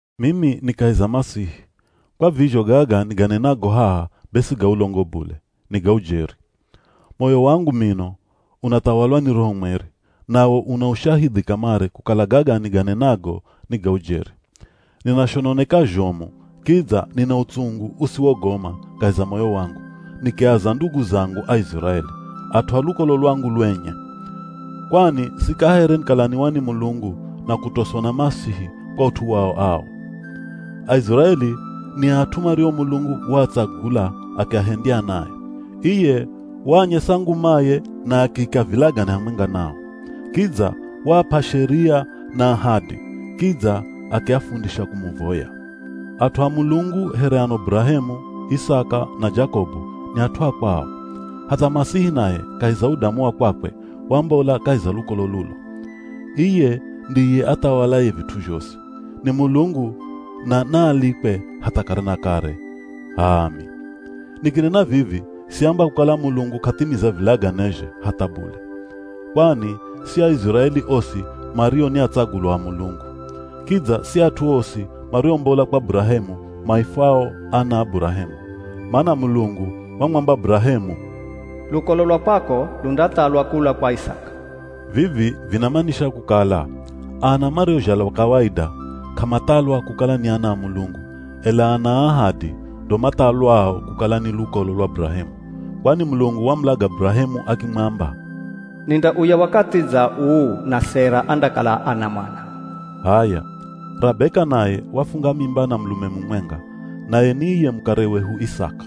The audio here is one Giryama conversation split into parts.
Mimi ni kahi za Masihi, kwa vizho gaga niganenago haha be si ga ulongo bule, ni ga ujeri. Moyo wangu mino unathawalwa ni Roho Mweri, nawo una ushahidhi kamare kukala gaga niganenago ni ga ujeri. Ninashononeka zhomu, kidza nina utsungu usiwogoma kahi za moyo wangu, nikiaza ndugu zangu Aiziraeli, at'u a lukolo lwangu lwenye. Kwani sikahere nikalaniwa ni Mulungu na kutoswa na Masihi kwa ut'u wao ao. Aiziraeli ni at'u mario Mulungu waatsagula akiahendya anae. Iye waanyesa ngumaye na akiika vilagane hamwenga nao. Kidza waap'a Sheria na ahadi, kidza akiafundisha kumuvoya. At'u a Mulungu here ano Burahemu, Isaka, na Jakobu ni at'u a kwao. Hatha Masihi naye kahi za udamu wa kwakwe wambola kahi za lukolo lulo. Iye ndiye athawalaye vit'u zhosi. Ni Mulungu, na naalikwe hatha kare na kare. H'aami. Nikinena vivi siamba kukala Mulungu k'athimiza vilaganezhe, hatha bule. Kwani si Aiziraeli osi mario ni atsagulwa a Mulungu. Kidza si at'u osi mariombola kwa Burahemu maifwao ana a Burahemu. Mana Mulungu wamwamba Burahemu, “Lukolo lwa kwako lundathalwa kula kwa Isaka.” Vivi vinamanisha kukala, ana mariozhalwa kawaida k'amathalwa kukala ni ana a Mulungu, ela ana a ahadi ndo mathalwao kukala ni lukolo lwa Burahemu. Kwani Mulungu wamulaga Burahemu akimwamba, “Nindauya wakathi dza uu na Sera andakala ana mwana.” H'aya, Rabeka naye wafunga mimba na mulume mumwenga, naye ni iye mukare wehu Isaka.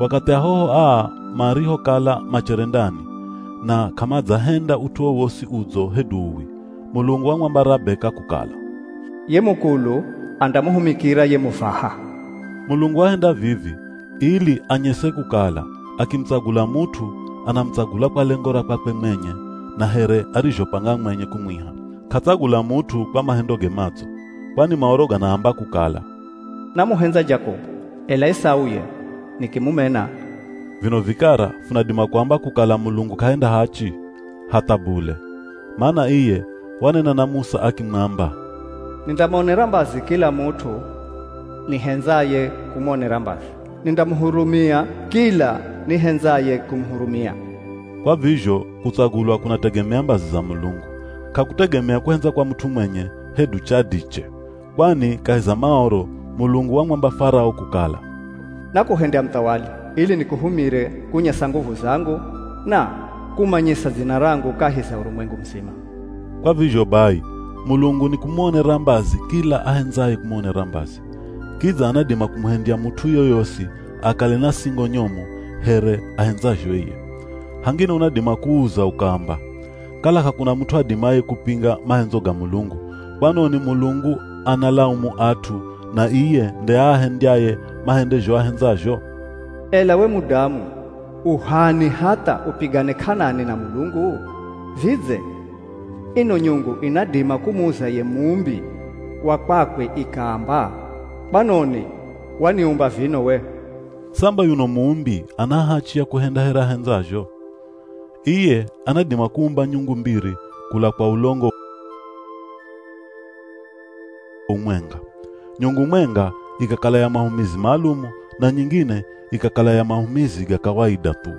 Wakathi ahoho aa marihokala machere ndani, na k'amadzahenda ut'u wowosi udzo hedu uwi, Mulungu wamwamba Rabeka kukala, “Ye mukulu andamuhumikira ye muvaha.” Mulungu wahenda vivi ili anyese kukala, akimutsagula mut'u anamutsagula kwa lengo ra kwakwe mwenye na here arizhopanga mwenye kumwiha. K'atsagula mut'u kwa mahendoge madzo. Kwani Maoro ganaamba kukala, “Namuhendza Jakobu, ela Esau ye, nikimumena.” Vino vikara funadima kuamba kukala Mulungu k'ahenda hachi? Hatha bule! Mana iye wanena na Musa akimwamba, “Nindamuonera mbazi kila mut'u nihendzaye kumuonera mbazi, Nindamuhurumia kila nihendzaye kumuhurumia.” Kwa vizho kutsagulwa kunategemea mbazi za Mulungu, k'akutegemea kuhendza kwa mut'u mwenye hedu chadiche. Kwani kahi za Maoro Mulungu wamwamba Farao kukala, “Nakuhendya muthawali ili nikuhumire kunyesa nguvu zangu na kumanyisa dzina rangu kahi za urumwengu muzima.” Kwa vizho bai, Mulungu nikumuonera mbazi kila ahendzaye kumuonera mbazi. Kidza anadima kumuhendya mut'u yoyosi akale na singo nyomu here ahendzazho iye. Hangine unadima kuuza ukaamba, “Kala k'akuna mut'u adimaye kupinga mahendzo ga Mulungu, kwanoni Mulungu analaumu at'u na iye nde aahendyaye mahende zho ahendzazho?” Ela we mudamu u h'ani hatha upigane k'anani na Mulungu? Vidze, ino nyungu inadima kumuza ye muumbi wa kwakwe ikaamba, “Kwanoni waniumba vino we?” Samba yuno muumbi ana hachi ya kuhenda here ahendzazho. Iye anadima kuumba nyungu mbiri kula kwa ulongo umwenga. Nyungu mwenga ikakala ya mahumizi maalumu, na nyingine ikakala ya mahumizi ga kawaida thu.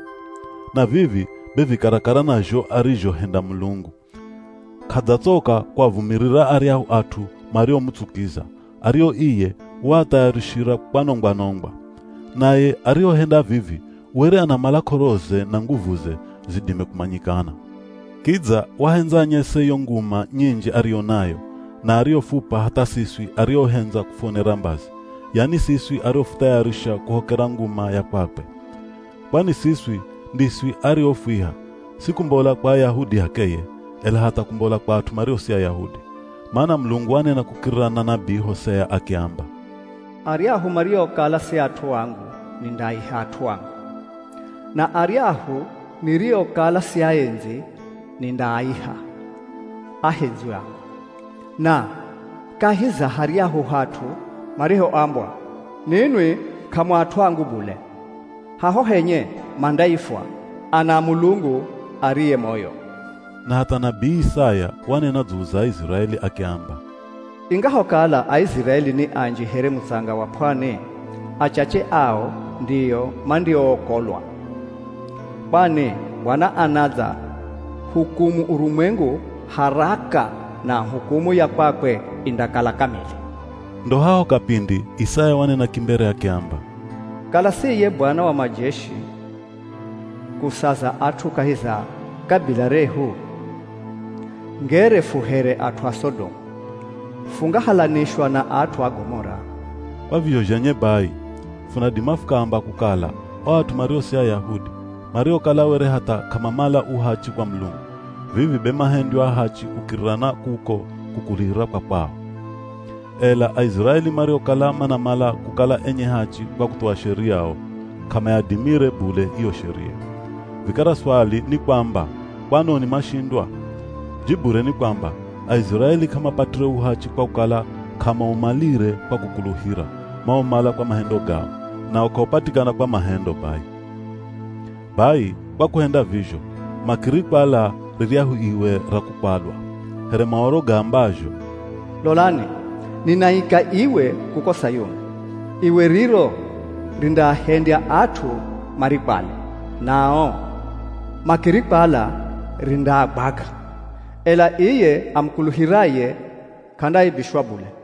Na vivi be vi karakara na zho arizhohenda Mulungu. K'adzatsoka kuavumirira aryahu at'u mariomutsukiza, ario iye waathayarishira kwanongwa-nongwa. Naye arihohenda vivi were anamala k'oroze na nguvuze zidime kumanyikana. Kidza wahendza anyese yo nguma nyinji ariyo nayo, na ariyofup'a hatha siswi ariohendza kufuonera mbazi, yani siswi ariofuthayarisha kuhokera nguma ya kwakwe. Kwani siswi ndiswi ariofwiha, si kumbola kwa Ayahudi h'akeye, ela hatha kumbola kwa at'u mario si Ayahudi. Mana Mulungu wanena kukirira na nabii Hosea akiamba, “Aryahu mariokala si at'u angu nindaaiha, ‘at'u angu.’ Na aryahu niriokala siaendzi nindaaiha, ‘ahendzwi angu.’” “Na kahi za haryahu hat'u marihoambwa, ‘Ninwi k'amu at'u angu bule,’ haho henye mandaifwa, ‘ana a Mulungu ariye moyo.’” Na hatha nabii Isaya wanena dzulu za Aiziraeli akiamba, “Ingahokala Aiziraeli ni anji here mutsanga wa p'wani, achache ao ndio mandiookolwa. Kwani Bwana anadza hukumu urumwengu haraka, na hukumu ya kwakwe indakala kamili.” Ndo haho kapindi Isaya wanena kimbere akiamba, “Kala si iye Bwana wa majeshi kusaza at'u kahi za kabila rehu, ngere fu here at'u a Sodomu, fungahalanishwa na at'u a Gomora.” Kwa vizho zhenye bai, funadima fukaamba kukala o at'u mario si Ayahudi, mariokala were hatha k'amamala uhachi kwa Mulungu, vivi be mahendywa ahachi kukirira na kuko kukuluhira kwa kwao. Ela Aiziraeli mariokala manamala kukala enye hachi kwa kuthuwa Sheria o, k'amayadimire bule iyo Sheria. Vikara swali ni kwamba, kwanoni mashindwa? Jibure ni kwamba, Aiziraeli k'amapatire uhachi kwa kukala k'amaumalire kwa kukuluhira, maumala kwa mahendo gao, nawo k'aupatikana kwa mahendo bai. Bai kwa kuhenda vizho, makirikwala riryahu iwe ra kukwalwa. Here Maoro gaambazho, “Lolani, ninaika iwe kuko Sayuni. Iwe riro rindaahendya at'u marikwale. Nao makirikwala rindaagwaga. Ela iye amukuluhiraye, k'andaaibishwa bule.”